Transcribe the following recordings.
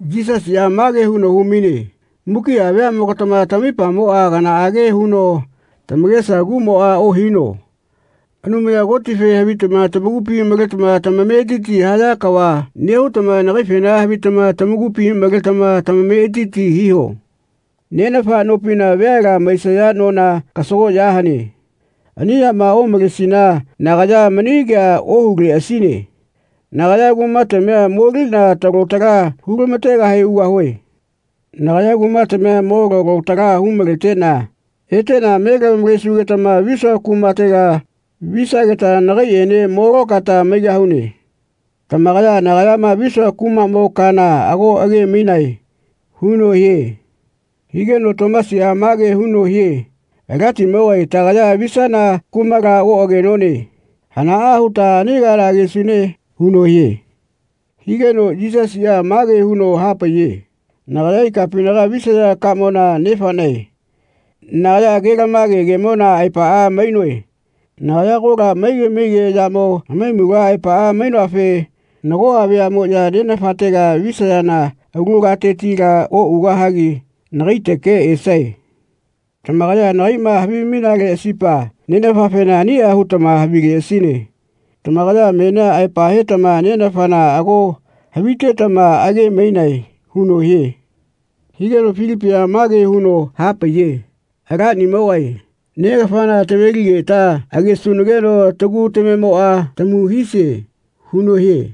Yisasiꞌa mage huno hu-maine “Mukiꞌa veaꞌmogatama tamaipamoꞌa kanaꞌage huno tamakesa kuꞌmoꞌa ohino. Anumaya Kotife havitama tamakupi maletama tamametiti haya kava nehutama nagaifena havitama tamakupi maletama tametiti hiho. Nenafa nopina veala maisaya nona kasagoꞌya hane. Ani yama omalesina nagaya mani kea ohuleꞌasine. Nagaya kumatamia moliꞌna talo tala hu-lama-tegahe ugahue. Nagaya kumatamia mo lalo tala hu-maleteꞌna eteꞌna me lamavalesugetama visua kumatela visageta nagaiꞌene mo lokaeta maigahune. Tamakaya nagayama visua kumaꞌmo kana ago age-mainae.” huno hie. Higeno Tomasiꞌa mage huno hie “Alatimogae tagaya visana kumala oꞌagenone. Hanaꞌa huta ani kana agesune?” huno hie. Higeno Yisasiꞌa mage huno hapaiye “Nagaya ikapinaga visaya kamona Nefaꞌnae. Nagaya ke-lamage kemona aepaꞌa mainoe. Nagaya agola maige maige yamo hamaimula aepaꞌa mainoafe nagoꞌa veaꞌmoꞌya Nenafatega visayana alu katetila oꞌugahagi nagaiteke esae. Tamakaya nagaiꞌma havimainaleꞌasipa Nenafafena aniꞌa hutama havileꞌasine. Tamakaya menia aepa hetama Nenafana ago havitetama age-mainae.” huno hie. Higeno Filipiꞌa mage huno hapaiye “Alanimogae negafana taveligeta agesunageno tagu tamemoꞌa tamu hisie.” huno hie.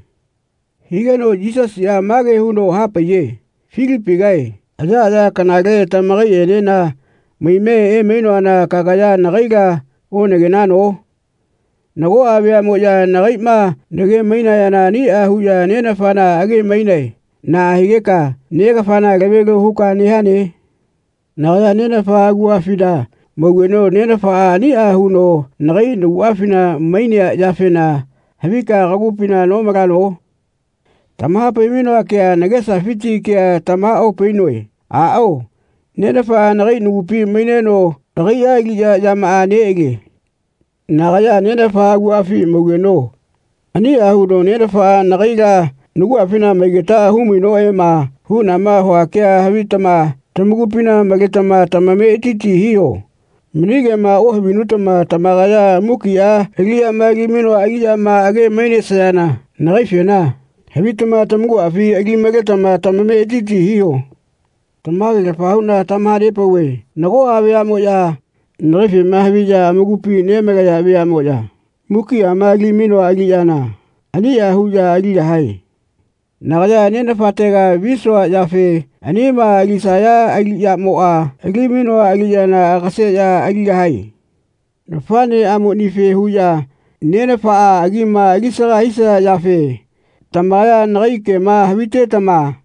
Higeno Yisasiꞌa mage huno hapaiye “Filipigae ayaꞌaya kanale tamakaiꞌenena maime emainoana kagaya nagaila onagenano? Nagoꞌa veaꞌmoꞌya nagaiꞌma nage-mainayana aniꞌa huꞌya Nenafana age-mainae. Naꞌa higeka ‘Negafana lave-lio huka nehane?’ Nagaya Nenafa aguꞌafina maugeno Nenafaꞌa aniꞌa huno nagai naguꞌafina mainea yafena havika kagupina nomalano? Tamaha-pai-mainoa kea nagesafiti kea tamaha-opainoe. Aꞌao. Nenafaꞌa nagai nagupi maineno agaiꞌa aliꞌyamaꞌa neꞌalie. Nagaya Nenafa aguꞌafi maugeno aniꞌa huno Nenafaꞌa nagaila naguꞌafina maigetaꞌa hu-mainoꞌema huꞌnama hua kea havitama tamakupina maletama tamametiti hiho. Mani kema ohavinutama tamakaya mukiꞌa aliꞌyama ali-mainoa aliꞌyama age-mainesayana nagaifena havitama tamakuꞌafi ali maletama tamametiti hiho. Tamage-lafa huꞌna tamaha-nepauve nagoꞌa veaꞌmoꞌya nagaifema haviꞌya amakupi nemalaya veaꞌmoꞌya mukiꞌama ali-mainoa aliꞌyana aniꞌa huꞌya aligahae. Nagaya Nenafatega visua yafe anima alisaya aliꞌyamoꞌa ali-mainoa aliꞌyana agaseꞌya aligahae. Nafaꞌneꞌamonife huꞌya Nenafaꞌa agima ali-saga hisaya yafe tamakaya nagai kema havitetama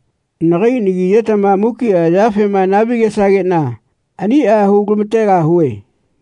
nagai nagi ayetama mukiꞌa yafena naha-vi-gesageꞌna aniꞌa hu-lama-tegahue.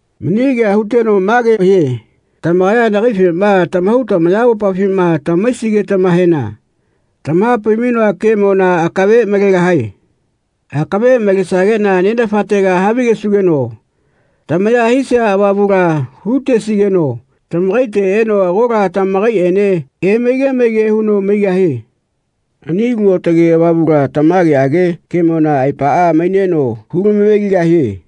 Mani kea huteno mage hie “Tamakaya nagaifema tamahau tamayamopafima tama-haisigetamahena tamaha-pai-mainoa kemona akave malegahae. Akave malesageꞌna Nenafatega havigesugeno tamaya hisia Avamula hu-tesigeno tamakaite eno agola tamakaiꞌene emaige maige huno maigahie. Ani Alu Aotage Avamula tamageꞌage kemona aepaꞌa maineno hulama-ve-ligahie.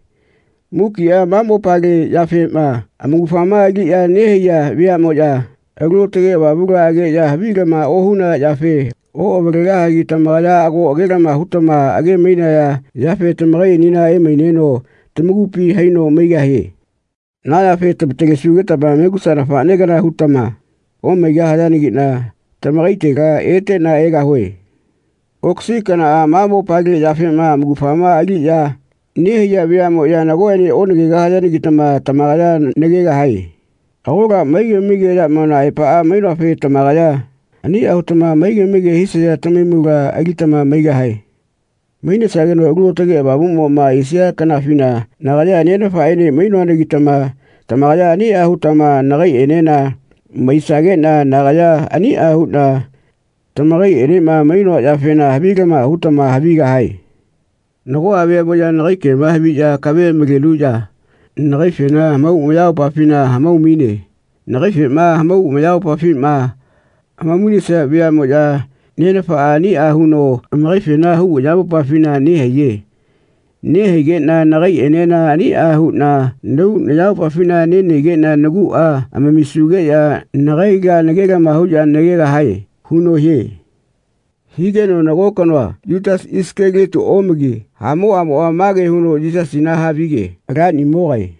Mukiꞌa ma mopale yafema amaugafama aliꞌya nehaiya veaꞌmoya Alu Aotage Avamula ageꞌya havilama ohunaya yafe oꞌavalegahagi tamakaya ago age-lama hutama age-mainaya yafe tamakaiꞌenena emaineno tamakupi haino maigahie. Na yafe tama-talesugetama megusa nafaꞌne kana hutama omaigahayanagiꞌna tamakaitela eteꞌna egahue. Okasi kanaꞌa ma mopale yafema amaugafama aliꞌya nehaiya veaꞌmoꞌya nagoꞌene onagegahayanagitama tamakaya nagegahae. Agola maige maige yamona aepaꞌa mainoafe tamakaya aniꞌa hutama maige maige hisaya tamahaimula alitama maigahae. Mainesageno Alu Aotage Avamuꞌmoꞌma esia kanafina nagaya Nenafaꞌene mainoanagitama tamakaya aniꞌa hutama nagaiꞌenena maisageꞌna nagaya aniꞌa huꞌna tamakaiꞌenema mainoa yafena havilama hutama havigahae. Nagoꞌa veaꞌmoꞌya nagai kema haviꞌya akave malenuꞌya nagaifena hamau amayamopafifna hamau-maine. Nagaifema hamau amayamopafima hamau-mainesia veaꞌmoꞌya Nenafaꞌa aniꞌa huno amakaifena hau ayamopafina nehaiye. Nehaigeꞌna nagaiꞌenena aniꞌa huꞌna nahau nayamopafina nenahaigeꞌna naguꞌa amamisugeꞌya nagaila nage-lama huꞌya nagegahae.” huno hie. Higeno nago kanoa, Yutasi Isakalioti omagi, hamoꞌamoꞌa mage huno Yisasina havige “Alanimogae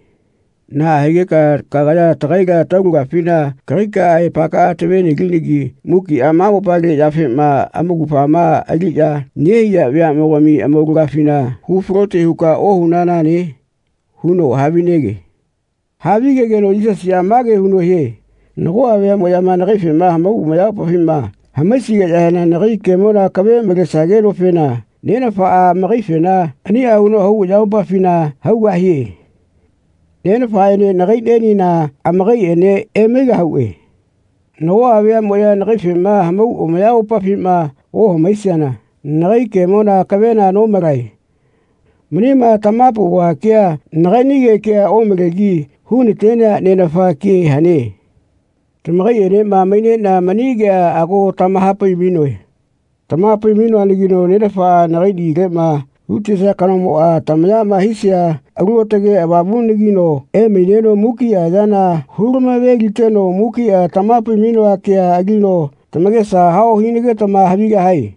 naꞌa higeka kagaya tagaila taulagafina kagaika aepakaꞌa tave-nelinagi mukiꞌa ma mopale yafema amaugafama aliꞌya nehaiya veaꞌmogami amaulagafina hu-falote huka ohunanane?” huno havinege. Havigegeno Yisasiꞌa mage huno hie “Nagoꞌa veaꞌmoꞌyama nagaifema hamau amayamopafima hamaisigeꞌyahena nagai kemona akave malesagenofena Nenafaꞌa amakaifena aniꞌa huno hau ayamopafina haugahie. Nenafaꞌene nagaiꞌnienena amakaiꞌene emaigahuꞌe. Nagoꞌa veaꞌmoꞌya nagaifema hamau amayamopafima ohamaisiana nagai kemona akavela nomalae. Manima tamaha-nepauva kea nagaiꞌnige kea omalegi hu-na-tenea Nenafa ke hane. Tamakaiꞌenema maineꞌna mani kea ago tamaha-pai-mainoe. Tamaha-pai-mainoanagino Nenafaꞌa nagai nagileꞌma hu-tesia kanomoꞌa, tamayama hisia Alu Aotage Avamulagino emaineno mukiꞌa yana hulamave-liteno mukiꞌa tamaha-pai-mainoa kea alino tamakesa hao hinagetama havigahae.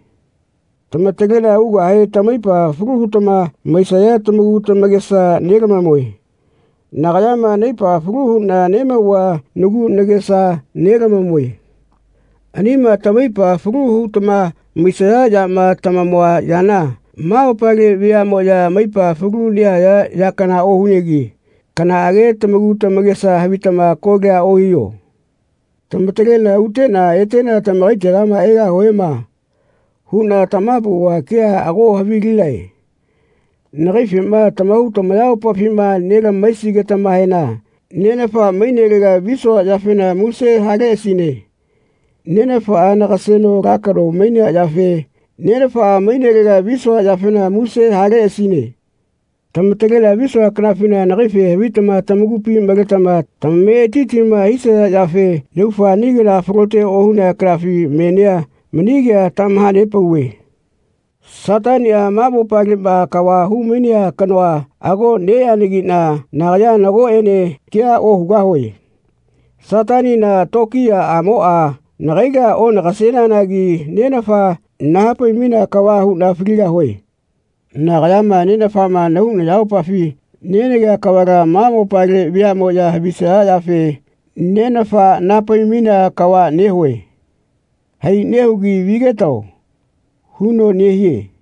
Tama-taleꞌna ugahe tamaipa falu hutama maisaya tamaku tamakesa nelamamue. Nagayama naipa falu huꞌna nemauva nagu nagesa nelamamue. Anima tamaipa falu hutama maisaya yama tamamua yana ma mopale veaꞌmoya amaipa falu nehaya ya kana ohunegi kanaꞌage tamaku tamakesa havitama kolia ohiho. ‘Tamataleꞌna uteꞌna eteꞌna tamakaitega egahuema.’ huꞌna tamaha-pauva kea ago havilinae. Nagaifema tamahau tamayamopafima nelamahaisigetamahena Nenafa mainelega visua yafena muse haleꞌasine. Nenafaꞌa nagaseno ala kano mainea yafe Nenafa mainelega visua yafena muse haleꞌasine. Tamataleꞌna visua kanafina nagaife havitama tamakupi maletama tamametitima hisaya yafe yaufa ani kana falote ohunea kanafi menia mani kea tamaha-nepauve. Sataniꞌa, ma mopaleꞌma kava hu-mainea kanoa ago neꞌeanagiꞌna nagaya nagoꞌene kea ohugahue. Satanina tokiyaꞌamoꞌa nagaila onagaseneanagi Nenafa nahapai-mainea kava huꞌna faligahue. Nagayama Nenafafema nahau nayamopafi nenagea kavala ma mopale veaꞌmoꞌya havisaya yafe Nenafa naha-pai-mainea kava nehue. Hai nehugi vigetao.” huno nehie.